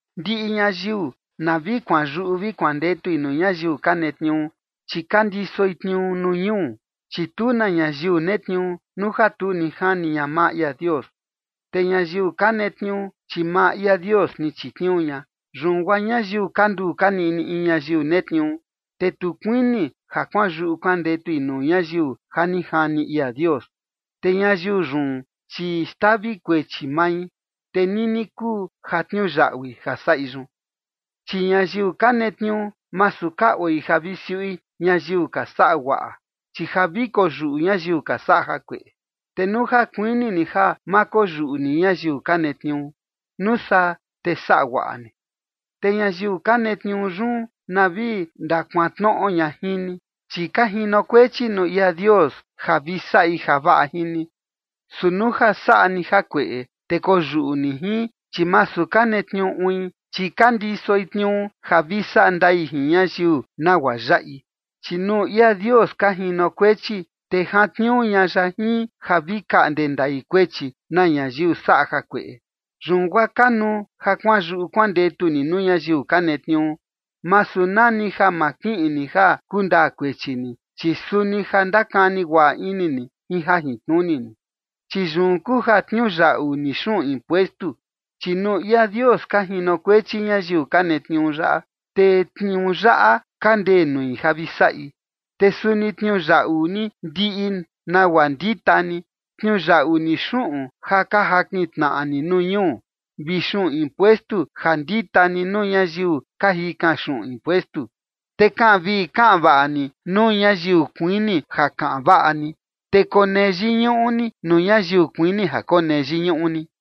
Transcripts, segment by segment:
Ndiꞌi ñayiu na vi kuanyuꞌu vi kuandetui nuu ñayiu ka netniuu, chi ka ndisoi tniuu nuu ñuu. Chi tu na ñayiu netniuu nuu ja tu ni jani ña maa ia Dios, te ñayiu ka netniuu, chi maa ia Dios ni chitniuu ña. Yun guaa ñayiu kanduu kaniꞌni in ñayiu netniuu, te tu kuini ja kuanyuꞌu kuandetui nuu ñayiu ja ni jani ia Dios, te ñayiu yun, chi xtavi kuechi mai, te nini kuu ja tniuyaꞌui ja saꞌi yun. Chi ñayiu ka netniuu, masu ka oi ja vi siuꞌi ñayiu ka saꞌa guaꞌa, chi ja vi koyuꞌu ñayiu ka saꞌa jakueꞌe. Te nuu ja kuini ni ja ma koyuꞌu ni ñayiu ka netniuu, nuu saa te saꞌa guaꞌa ni, te ñayiu ka netniuu yun na vi ndakuantnoꞌo ña jin ni. Chi ka jinokuechi nuu ia Dios ja vi saꞌi javaꞌa jin ni. Su nuu ja saꞌa ni jakueꞌe, te koyuꞌu ni jin, chi masu ka netniuu uin, chi ka ndisoi tniuu ja vi saꞌa ndai jin ñayiu nagua yaꞌi. Chi nuu ia Dios ka jinokuechi, te jantniuu ña ya jin ja vi kaꞌnde ndai kuechi na ñayiu saꞌa jakueꞌe. Yun guaa kanuu ja kuanyuꞌu kuandetu ni nuu ñayiu ka netniuu, masu na ni ja ma kiꞌin ni ja kundaa kuechi ni, chi suni ja ndakani guaꞌa ini ni jin jajintnuni ni. Chi yun kuu ja tniuyaꞌu ni xuꞌun impuestu. Chi nuu ia Dios ka jinokuechi ñayiu ka netniuu yaꞌa, te tniuu yaꞌa ka ndee nui ja vi saꞌi. Te suni tniuyaꞌu ni ndiꞌi nagua ndita ni: tniuyaꞌu ni xuꞌun ja ka jakin tnaꞌa ni nuu ñuu, vi xuꞌun impuestu ja ndita ni nuu ñayiu ka jikan xuꞌun impuestu. Te kaꞌan vii vi kaꞌan vaꞌa ni nuu ñayiu kuini ja kaꞌan vaꞌa ni, te konee yiñuꞌu ni nuu ñayiu kuini ja konee yiñuꞌu ni.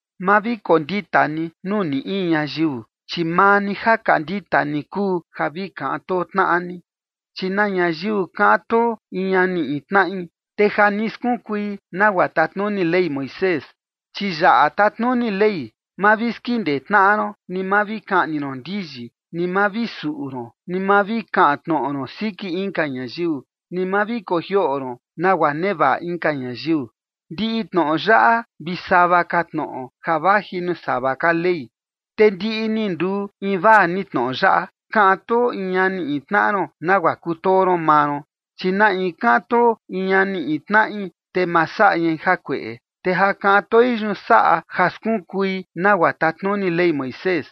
Ma vi kondita ni nuu ni in ñayiu, chi maa ni ja ka ndita ni kuu ja vi kaꞌan too tnaꞌa ni, chi na ñayiu kaꞌan too in ñani in tnaꞌi, te ja ni skunkui nagua tatnuni Ley Moisés. Chi yaꞌa tatnuni Ley: “Ma vi skindee tnaꞌa ron, ni ma vi kaꞌni ron ndiyi, ni ma vi suꞌu ron, ni ma vi kaꞌan tnoꞌo ron siki inka ñayiu, ni ma vi kojioꞌo ron nagua nevaꞌa inka ñayiu”. Ndiꞌi tnoꞌo yaꞌa vi sava ka tnoꞌo ja vaji nuu sava ka Ley, te ndiꞌi ni nduu invaa ni tnoꞌo yaꞌa: “Kaꞌan too in ñani in tnaꞌa ron nagua kutoo ron maa ron”. Chi na in kaꞌan too in ñani in tnaꞌi, te ma saꞌa ñai jakueꞌe, te ja kaꞌan toi yun saꞌa ja skunkui nagua tatnuni Ley Moisés.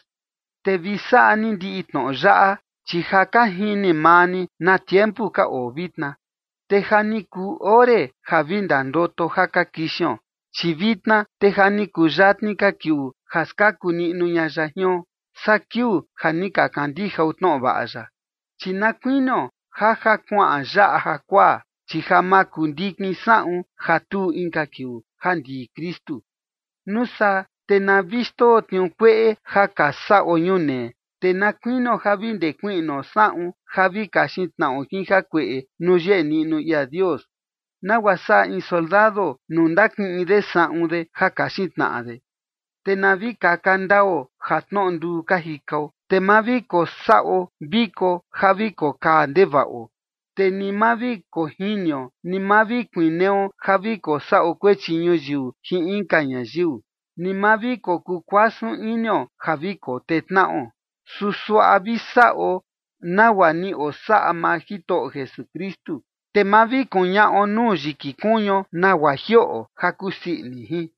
Te vi saꞌa ni ndiꞌi tnoꞌo yaꞌa, chi ja ka jini maa ni na tiempu ka oo vitna, te ja ni kuu ore ja vi ndandoto ja ka kixion, chi vitna te ja ni kuyatni ka kiuu ja skaku niꞌnu ña ya jion, saa kiuu ja ni ka kandijao tnoꞌo vaꞌa ya. Chi na kuinio ja ja kuaꞌan yaꞌa jakuaa, chi ja makundikin saꞌun ja tuu inka kiuu ja ndii Kristu. Nuu saa te na vi xndoo tniuu kueꞌe ja ka saꞌo ñunee, te na kuinio ja vi ndekuiꞌnuo saꞌun ja vi kaxin tnaꞌo jin jakueꞌe nuu yeꞌe niꞌnu ia Dios, nagua saꞌa in soldado nuu ndakiꞌin de saꞌun de ja kaxin tnaꞌa de. Te na vi kaka ndao ja tnoꞌo nduu ka jikao. Te ma vi kosaꞌo viko ja vi kokaa ndevaꞌo, te ni ma vi kojinio, ni ma vi kuineo ja vi kosaꞌo kuechi ñuyiu jin inka ñayiu, ni ma vi kokukuasun inio ja vi kotee tnaꞌo. Su suaꞌa vi saꞌo nagua ni osaꞌa maa Jitoꞌo Jesukristu, te ma vi kuñaꞌo nuu yiki kuñuo nagua jioꞌo ja kusii ini jin.